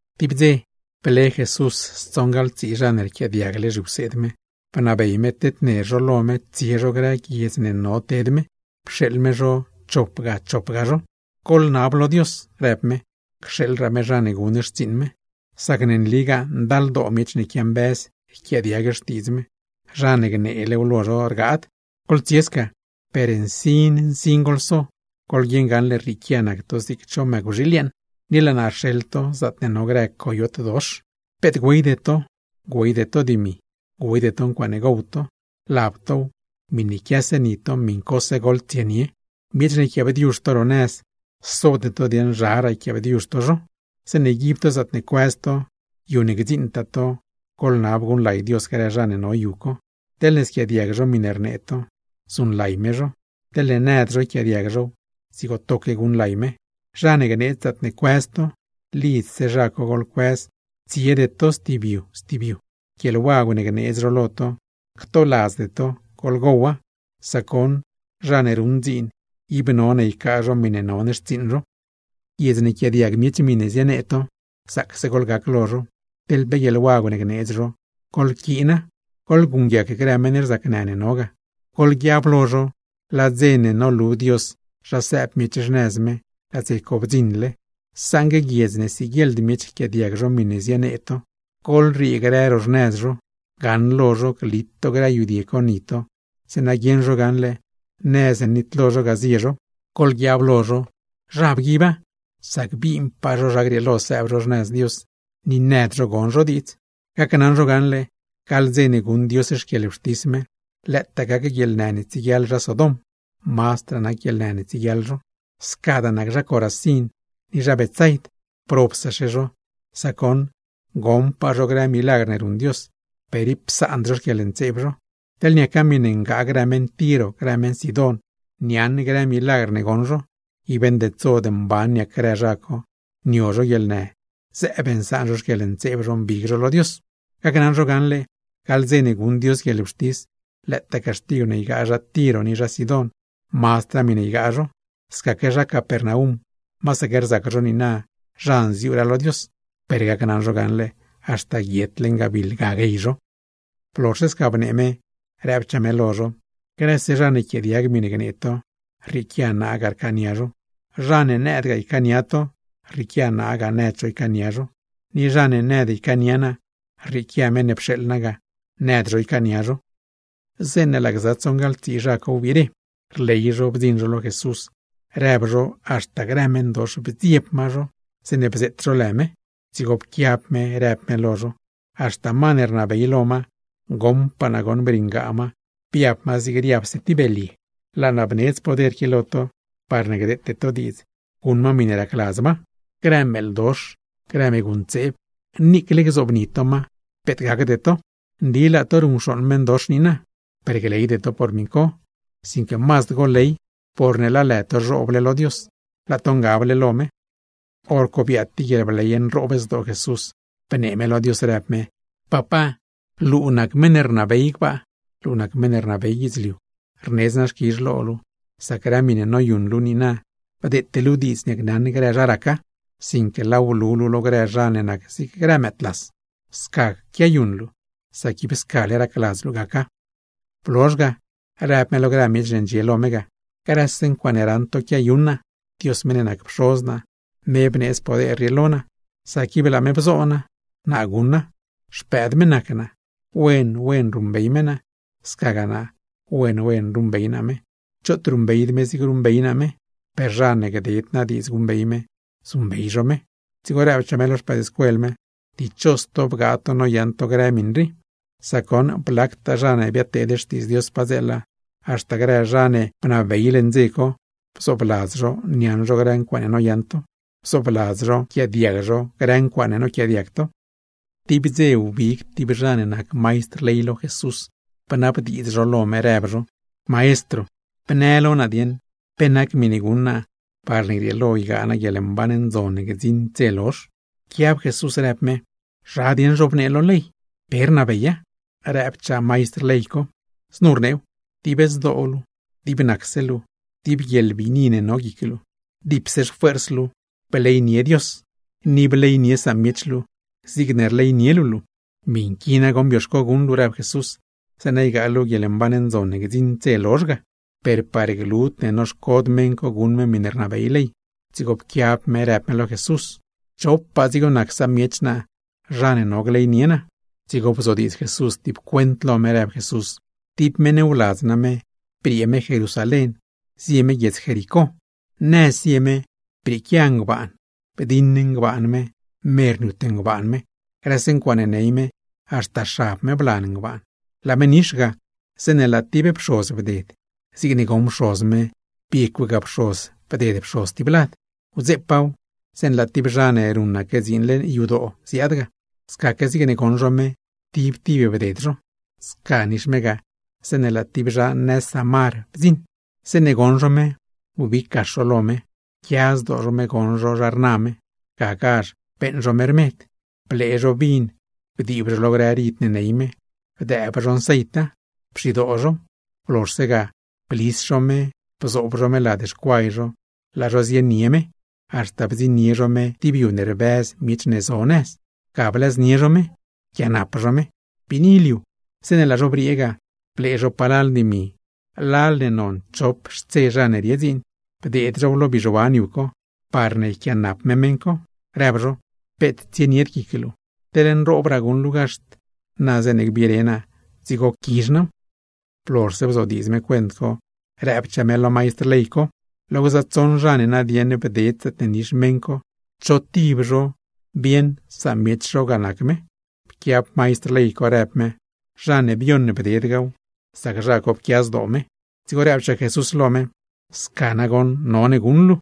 Tib dze, ble Jesús stsoṉgaḻtsii zha ne rquiaadiagle zhiwseed me, bnabey me tedner zho lo me tsie zho grë guiedz ne no ted me, pxeeḻ me zho chopga chopga zho. ―Goḻnab lo Dios ―rëb me―, cxeeḻraa me zha ne guṉ xtsiiṉ me. Sac ne nligaa ndaldoo miech ne quiambëz yquiaadiag Xtiidz me, zha ne gneelew lo zho rgaad. Goḻtsie sca, per nsin nsin goḻso. Goḻguieṉ gaṉle rrieequia nac to zig cho mëcwxiil yeeṉ, ni laa naa rxeḻ to zaatne no grë coyot dox. Peet güeyde to, güeyde to dimi, güeyde to ncuaaṉe gow to, lab tow, miṉe quiase ni to miṉcose goḻtsienie. ’Miech ne yquiaabdiuzh to nëz, sode to dieeṉ zharaa yquiaabdiuzh to zho. Zeeṉe yguib to zaatne cuëz to, yu ne gdziṉtaa to, goḻnab guṉlay Dios grë zha ne no yu co. Teḻne squiaadiag zho miṉe rnee to, zuṉlay me zho; teḻne nëdgaa zho yquiaadiag zhow, dzigo toque guṉlay me. Zha ne gneedz zaatne cuëz to, lidzse zha co goḻcuëz, tsiede to stib yu stib yu; guieḻwagw ne gneedz zho lo to, ctoladzde to goḻgowa; sac goṉ zha ne ruṉ dziin, ib none ycaa zho miṉe non xtsiiṉ zho. ’Guiedz ne yquiaadiag miech miṉe zienee to, zaacse goḻgac lo zho, teḻ pe guieḻwagw ne gneedz zho, goḻquiina; goḻguṉguiac grë meṉ rzacnë ne no ga. Goḻguiab lo zho, laa dze ne nolu Dios zha sëëb miech xnëz me, laa dze co bdziṉle. Saṉgue guiedz ne siguieḻd miech yquiaadiag zho miṉe zienee to, goḻriee grë ro xnëz zho, gaṉlo zho glit to grë yudie co ni to, zeeṉa guieṉ zho gaṉle nëz ne nitlo zho ga zie zho. Goḻguiab lo zho, zha bguiba, sac binpaa zho zha grieelo sëëb zho xnëz Dios ni nëd zho gon zho diidz. Gacnaṉ zho gaṉle, gaḻ dze ne guṉ Dios xquieḻwxtis me, lëëtaa gac guieḻnë ne tsieguiaḻ zha Sodom, mazdraa nac guieḻnë ne tsieguiaḻ zho. ’Scadaa nac zha Corazín ni zha Betsaid. ¡Probsaxe zho, sac goṉ goṉpaa zho grë milagr ne ruṉ Dios, per ib psaand zho xquieḻntseeb zho! Teḻ niaca miṉe ngaa grë meṉ Tiro, grë meṉ Sidón, niaṉ grë milagr ne goṉ zho, ib ndedsod mban niac grë zha co nio zho guieḻnë, zëëb nsaan zho xquieḻntseeb zho mbig zho lo Dios. Gacnaṉ zho gaṉle, gaḻ dze ne guṉ Dios guieḻwxtis, lëëtaa caxtigw ne ygaa zha Tiro ni zha Sidón, mazdraa miṉe ygaa zho. Scaque zha Capernaum, masaque rzac zho niina zha nziuuraa lo Dios, per gacnaṉ zho gaṉle haxta guiet leṉ gabiḻ ga guey zho. Blozhse sca bnee me, rëbchaa me lo zho: ―Grëse zha ne yquiaadiag miṉe gnee to, rrieequia naa ga rcaania zho. Zha ne nëdgaa ycaania to, rrieequia naa ga nëd zho ycaania zho; ni zha ne nëd ycaania naa, rrieequia meṉ ne pxeeḻ naa ga nëd zho ycaania zho. Zeeṉe laa gza tsoṉgaḻtsii zha co wbire, rley zho bdziṉ zho lo Jesús. Rëb zho haxta grë meṉdox bdzieb ma zho, zeeṉe bzeet zho lë me. Dzigo pquiab me rëb me lo zho: ―Haxta ma ne rnabey lo ma, goṉpaa naa goṉ briṉgaa ma, biab ma zig riabse tib belye. Laa naa bneedz poder qui lo to, parne gdeete to diidz guṉ ma miṉe racladz ma; grë meeḻdox, grë meegu ntseeb, niicle gzoobni to ma, peet gacde to. Nli laa to ruṉcxooṉ meṉdox niina, per gleyde to por miṉ co, sinque mazd goḻley porne laa lë to zhooble lo Dios, laa to ngable lo me. Horco biaad tib guieḻbley nroob zdoo Jesús, bnee me lo Dios, rëb me: ―Papá, luu nac meṉ ne rnabey gbaa, luu nac meṉ ne rnabey guidzliu, rnedz naa xquizh lo luu, sac grë miṉe noyuṉ luu nu niina, bdeete luu diidz niacnaṉ grë zha raca, sinque laaw blu luu lo grë zha ne nac zig grë mëëdlas. Sca quiayuṉ luu, sac ib scale racladz luu gaca. Blozh ga rëb me lo grë miech ne ndxie lo me ga: ―Grëse ncuaaṉe raṉ to quiayuṉ naa, Dios meṉ ne nac Pxoz naa, me bneedz poder rii lo naa; sac ib laa me bzo naa, naa guṉa. Xpëëd me nac naa, wen wen ruṉbey me naa, scagaa naa wen wen ruṉbey naa me. Choot ruṉbeyd me zigne ruṉbey naa me, per zha ne gded naa diidz guṉbey me, zuṉbey zho me. Dzigo rëbchaa me lo xpëëdscuel me: ―Dichos to bgaa to noyaṉ to grë miṉ rii. Sac goṉ blactaa zha ne biadteed xtiidz Dios padzeela, haxta grë zha ne bnabey leṉ dze co, bzoobladz zho niaṉ zho grë ncuaaṉe noyaṉ to, bzoobladz zho nquiaadiag zho grë ncuaaṉe noquiaadiag to. Tib dze wbig tib zha ne nac maistr ley lo Jesús, bnabdiidz zho lo me, rëb zho: ―Maestro, bnë lo naa dieṉ, ¿pe nac miṉe guṉ naa parne grieelo ygaa naa guieḻmban ndzon ne gdziṉd dze lozh? Pquiab Jesús rëb me: ―¿Zha dieṉ zhobnee lo ley? ¿Pe rnabeya? Rëbchaa maistr ley co: ―Znu rneew: “Dib zdoo luu, dib nacse luu, dib guieḻbiini ne no guic luu, dipse xfuers luu, bleynie Dios; ni bleynie samiech luu, zigne rleynie luu luu.” ―¡Miṉ qui nagoṉ bioxco guṉ luu ―rëb Jesús―, zeeṉa ygaa luu guieḻmban ndzon ne gdziṉd dze lozh ga! Per par glud ne noxcod me guṉ me miṉe rnabey ley, dzigo pquiaalo me rëb me lo Jesús: ―¿Chopaa dzigo nac samiech naa, zha ne no gleynie naa? Dzigo bzodiidz Jesús tib cuent lo me, rëb Jesús: ―Tib meṉ wladz name briee me Jerusalén zie me guiedz Jericó. Nëz zie me brieequia ngbaan, bdiṉ ngbaan me, mer niut ngbaan me; grëse ncuaaṉe ney me, haxta xab me blan ngbaan. Laa me nix ga, zeeṉe laa tib pxoz bded. Zigne goṉ pxoz me, biecwga pxoz bded pxoz tib lad. Wdzeepaaw, zeeṉe laa tib zha ne ruṉaque dziin leṉ yadoo ziaad ga; scaque zigne goṉ zho me, tib tib bded zho. Sca nix me ga, zeeṉe laa tib zha Samar bdziṉ. Zeeṉe goṉ zho me, wbig gax zho lo me; pquia zdoo zho me goṉ zho zha rna me. Gagazh beeṉ zho me rmed, blee zho vin bdiib zho lo grë rid ne ney me, bdëëb zho nceita, pxidoo zhow. Blozhse ga, blis zho me bzoob zho me lad xcuay zho laa zho zienie me, haxta bdziṉnie zho me tib yu ne rbëz miech ne zo nëz; ga blëznie zho me, pquianap zho me. ’Biini liu, zeeṉe laa zho briee ga, blee zho palal dimi, lal ne non chop xtse zha ne rie dziin, bdeed zhow lo bizhuan yu co, parne yquiaanap me meṉ co, rëb zho: “Peet tsienied guic luu, teḻne nroobraa guṉ luu gaxt, na zeeṉe gbire naa dzigo quizh naaw.” Blozhse bzodiidz me cuent co, rëbchaa me lo maistr ley co: ―Lo gza tsoṉ zha ne nadieṉ bded zaatne nix meṉ co, ¿cho tib zho bieṉ samiech zho ga nac me? Pquiab maistr ley co rëb me: ―Zha ne bioṉ bded gaw, sac zha co pquia zdoo me. Dzigo rëbchaa Jesús lo me: ―Sca nagoṉ none guṉ luu.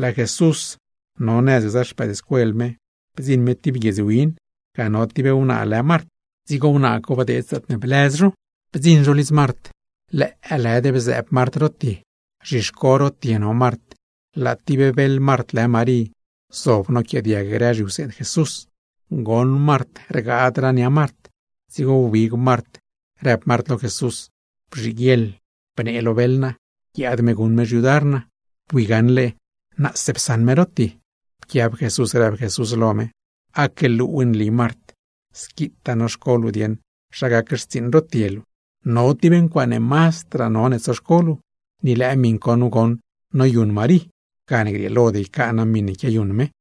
Laa Jesús no nëz gza xpëëdscuel me. Bdziṉ me tib guiedz win, ga no tib wnaa lë Mart, dzigo meṉ co bdeed zaatne blëz zho. Bdziṉ zho lidz Mart, lëëlëd bzëëb Mart ro tie. Zhixco ro tie no Mart, laa tib beḻ Mart lë Marí zob noquiaadiag grë zhiwseed Jesús. Goṉ Mart rgaadraa nia Mart, dzigo wbig Mart rëb Mart lo Jesús: ―Bzhiguieḻ bnee lo beḻ naa guiaad me guṉ me xyudar naa. Bui gaṉle tipse naa psaṉ me ro tie. Pquiab Jesús rëb Jesús lo me: ―Aque luuw nli Mart, squitaa noxco luu dieṉ zha gac xtsiiṉ ro tie luu. No tib ncuaaṉe mazdraa none tsoxco luu, ni lëë miṉ co nu goṉ noyuṉ Marí; gane grieelod ycaa naa miṉe quiayuṉ me.